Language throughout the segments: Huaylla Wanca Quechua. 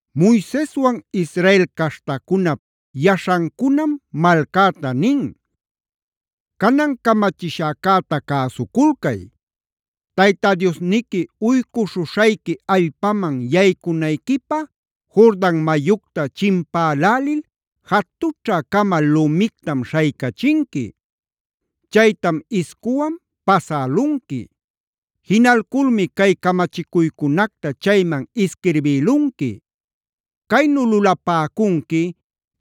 Moiseswan Israel caśhtacunap yaśhancunam malcäta nin: “Canan camachishäcäta cäsuculcay. Tayta Diosniqui uycuśhuśhayqui allpaman yaycunayquipä Jordan mayucta chimpälälil jatućhä-cama lumictam śhaycachinqui. Chaytam iscuwan pasälunqui. Jinalculmi cay camachicuycunacta chayman isquirbïlunqui. Caynu lulapäcunqui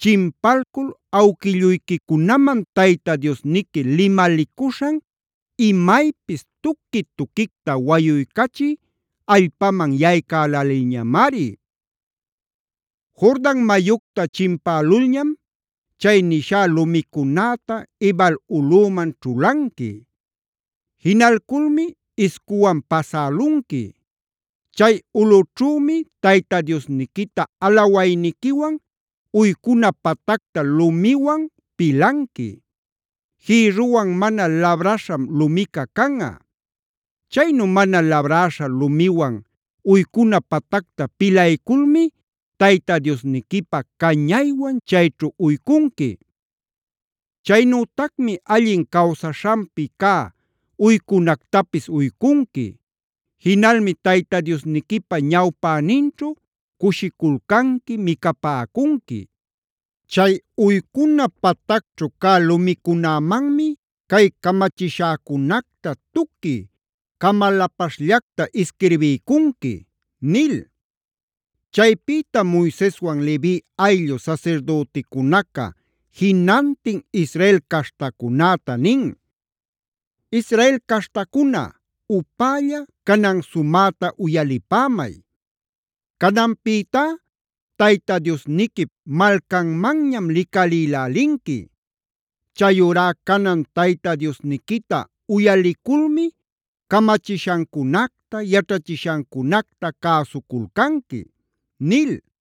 chimpalcul awquilluyquicunaman Tayta Diosniqui limalicuśhan imaypis tuqui-tuquicta wayuycachï allpaman yaycälälilñamari. Jordan mayucta chimpälulñam chay nishá lumicunäta Ebal ulꞌüman ćhulanqui. Jinalculmi iscuwan pasälunqui. Chay ulꞌućhümi Tayta Diosniquita alawayniquiwan uycuna patacta lumiwan pilanqui; jïrruwan mana labraśham lumica canꞌa. Chaynu mana labräśha lumiwan uycuna patacta pilayculmia Tayta Diosniquipä cañaywan chayćhu uycunqui. Chaynütacmi allin cawsaśhanpi cä uycunactapis uycunqui. Jinalmi Tayta Diosniquipä ñawpäninćhu cushiculcanqui, micapäcunqui. Chay uycuna patacćhu cä lumicunämanmi cay camachishäcunacta tuqui camalapaśhllacta isquirbiycunqui” nil.b Chaypïtam Moiseswan Levi ayllu sasirdüticunaca jinantin Israel caśhtacunäta nin: “Israel caśhtacuna upälla, canan sumäta uyalipämay. Cananpïtá Tayta Diosniquip malcanmanñam licalïlälinqui. Chayurá canan Tayta Diosniquita uyaliculmi camachishancunacta, yaćhachishancunacta cäsuculcanqui” nil.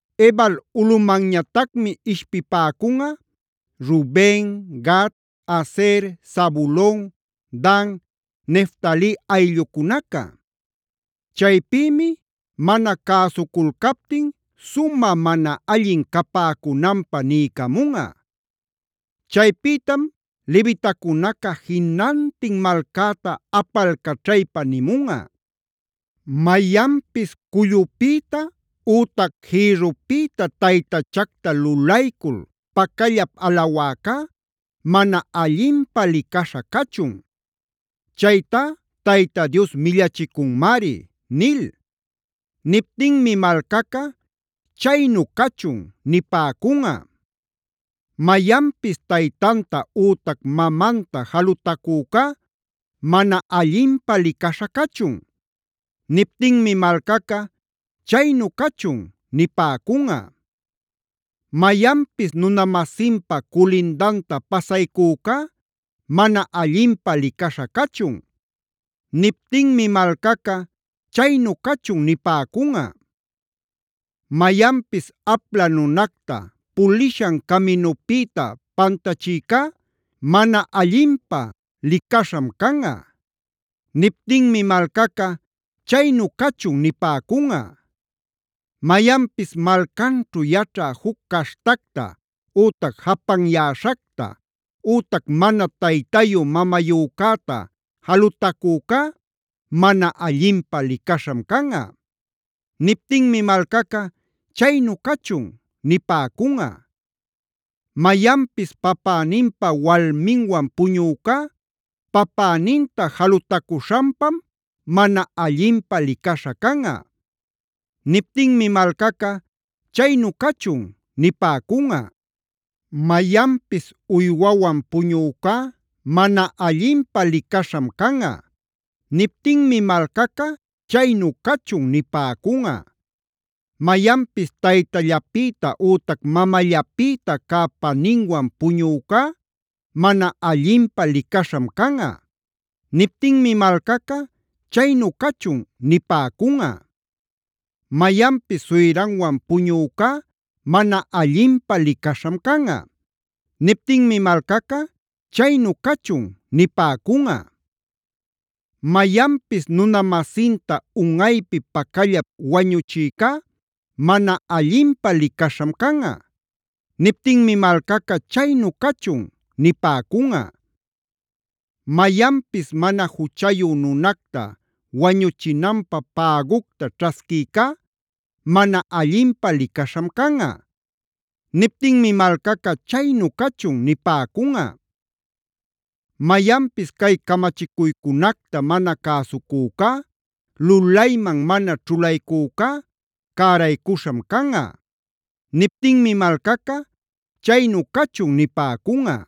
Ebal ulꞌumanñatacmi ishpipäcunꞌa: Ruben, Gad, Aser, Zabulon, Dan, Neftali ayllucunaca. Chaypïmi mana cäsuculcaptin sumä mana allin capäcunanpä niycamunꞌa. Chaypïtam levitacunaca jinantin malcäta apalcaćhaypa nimunꞌa: ‘Mayanpis cullupïta ütac jïrrupïta taytachacta lulaycul pacallap alawäcá, mana allinpä licaśha cachun;d chaytá Tayta Dios millachicunmari’ nil. Niptinmi malcaca: ‘Chaynu cachun’ nipäcunꞌa. “Mayanpis taytanta ütac mamanta jalutacücá mana allinpä licaśha cachun.e Niptinmi malcaca: ‘Chaynu cachun’ nipäcunꞌa. “Mayanpis nuna-masinpa culindanta pasaycücá mana allinpä licaśha cachun.f Niptinmi malcaca: ‘Chaynu cachun’ nipäcunꞌa. “Mayanpis apla nunacta pulishan caminupïta pantachïcá mana allinpä licaśham canꞌa.g Niptinmi malcaca: ‘Chaynu cachun’ nipäcunꞌa. “Mayanpis malcanćhu yaćhä juc caśhtacta, ütac japanyäśhacta, ütac mana taytayu mamayücäta jalutacücá mana allinpä licaśham canꞌa.h Niptinmi malcaca: ‘Chaynu cachun’ nipäcunꞌa. “Mayanpis papäninpa walminwan puñücá papäninta jalutacüśhanpam mana allinpä licaśha canꞌa.i Niptinmi malcaca: ‘Chaynu cachun’ nipäcunꞌa. “Mayanpis uywawan puñücá mana allinpä licaśham canꞌa.j Niptinmi malcaca: ‘Chaynu cachun’ nipäcunꞌa. “Mayanpis taytallapïta ütac mamallapïta cä paninwan puñücá mana allinpä licaśham canꞌa.k Niptinmi malcaca: ‘Chaynu cachun’ nipäcunꞌa. “Mayanpis suyranwan puñücá mana allinpä licaśham canꞌa.l Niptinmi malcaca: ‘Chaynu cachun’ nipäcunꞌa. “Mayanpis nuna-masinta unꞌaypi pacallap wañuchïcá mana allinpä licaśham canꞌa.m Niptinmi malcaca: ‘Chaynu cachun’ nipäcunꞌa. “Mayanpis mana juchayu nunacta wañuchinanpä pägucta ćhasquïcá mana allinpä licaśham canꞌa. Niptinmi malcaca: ‘Chaynu cachun’ nipäcunꞌa. “Mayanpis cay camachicuycunacta mana cäsucücá, lulayman mana ćhulaycücá cäraycuśham canꞌa.n Niptinmi malcaca: ‘Chaynu cachun’ nipäcunꞌa.